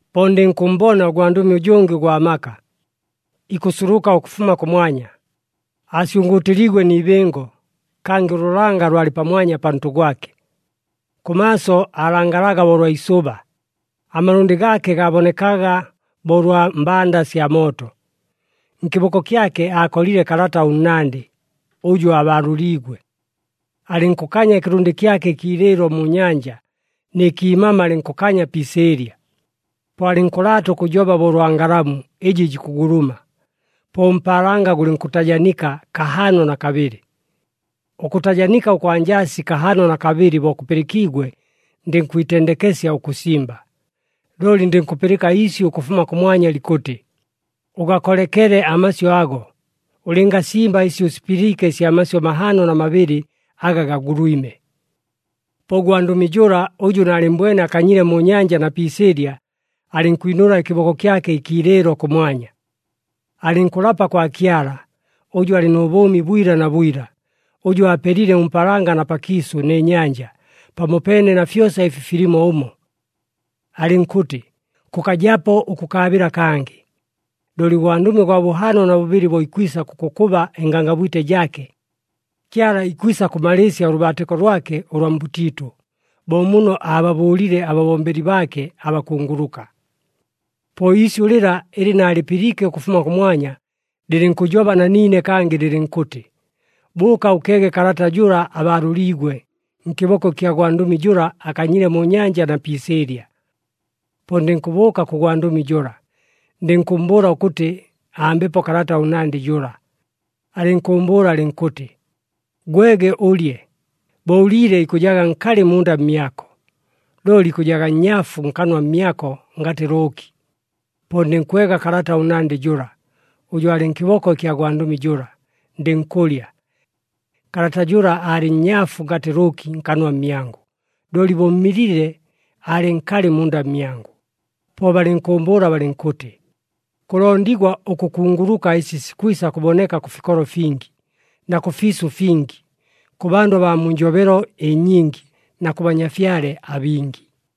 Po ndɨnkʉmmbona ʉgwandʉmi ʉjʉngɨ ʉgwa maka, ikʉsuluka ʉkʉfuma kʉmwanya. Aasyʉngʉʉtɨliigwe ni ibɨngo, kangɨ ʉlʉlanga lwalɨ pamwanya pantʉ gwake. Kʉmaaso aalangalaga bo ʉlwa isʉba, amalʉndɨ gaake gaabonekaga bo ʉlwa mbanda sya mooto. Nkɨboko kyake aakolile kalata ʉnnandɨ, ʉjʉ aabaalʉliigwe. Alɨnkʉkanya ɨkɨlʉndɨ kyake ɨkiilɨɨlo mu nyanja, nɨ kiimama alɨnkʉkanya pi isɨɨlya. Po alɨnkʉlaata ʉkʉjoba bo ʉlwa ngalamu ɨjɨ jikʉguluma. Po ʉmpaalanga gʉlɨnkʉtajanika kahaano na kabɨlɨ. Ʉkʉtajanika ʉkwa njasi kahaano na kabɨlɨ bo kʉpɨlɨkiigwe, ndɨnkwitendekesya ʉkʉsimba. Looli ndɨnkʉpɨlɨka iisyʉ ʉkʉfuma kʉmwanya likʉtɨ, “Ʉgakolekele amasyʉ ago! Ʉlɨngasimba ɨsi ʉsipɨliike ɨsya masyʉ mahaano na mabɨlɨ aga gagulwime.” Po ʉgwandʉmi jʉla, ʉjʉ naalɨmmbwene akanyile mu nyanja na pi isɨɨlya, alɨnkwinʉla ɨkɨboko kyake ɨkiilɨɨlo kʉmwanya. Alɨnkʉlapa kwa Kyala, ʉjʉ alɨ nʉ bʉʉmi bwila na bwila, ʉjʉ aapelile ʉmpaalanga na pakiisʉ nɨ nyanja, pamopeene na fyosa ɨfi filimo ʉmo. Alɨnkʉtɨ, “Kʉkajapo ʉkʉkaabɨla kangɨ. Looli ʉgwandʉmi ʉgwa bʉhaano na bʉbɨlɨ bo ikwisa kʉkʉkʉba ɨngangabwite jaake, Kyala ikwisa kʉmalɨɨsya ʉlʉbaatɨko lwake ʉlwa mbʉtiitʉ, bo muno aababʉʉlile ababombeli baake abakunguluka.” Po iisyʉ lɨla ɨlɨ naalɨpɨliike ʉkʉfuma kʉmwanya, lɨlɨnkʉjoba na niine kangɨ lɨlɨnkʉtɨ, “Bʉʉka ʉkeege kalata jʉla abaalʉliigwe, nkɨboko ɨkya gwandʉmi jʉla akanyile mu nyanja na pi isɨɨlya.” Po ndɨnkʉbʉʉka kʉ gwandʉmi jʉla, ndɨnkʉmmbʉʉla ʉkʉtɨ, ambepo kalata ʉnnandɨ jʉla. Alɨnkʉʉmbʉʉla alɨnkʉtɨ, “Gwege ʉlye. Bo ʉliile ikʉjaga nkalɨ munda mmyako, looli ikʉjaga nnyaafu nkanwa mmyako ngatɨ lʉʉki.” Po ndɨnkwega kalata ʉnnandɨ jʉla, ʉjʉ aalɨ nkɨboko ɨkya gwandʉmi jʉla, ndɨnkʉlya. Kalata jʉla aalɨ nnyaafu ngatɨ lʉʉki nkanwa mmyangʉ, looli bo mmilile, aalɨ nkalɨ munda mmyangʉ. Po balɨnkʉʉmbʉʉla balɨnkʉtɨ, “Kʉlondigwa ʉkʉkunguluka ɨsi sikwisa kʉboneka kʉ fikolo fingi, na kʉfiisʉ fingi, kʉ bandʉ abaa mu njobelo ɨnyingi, na kʉ banyafyale abingi.”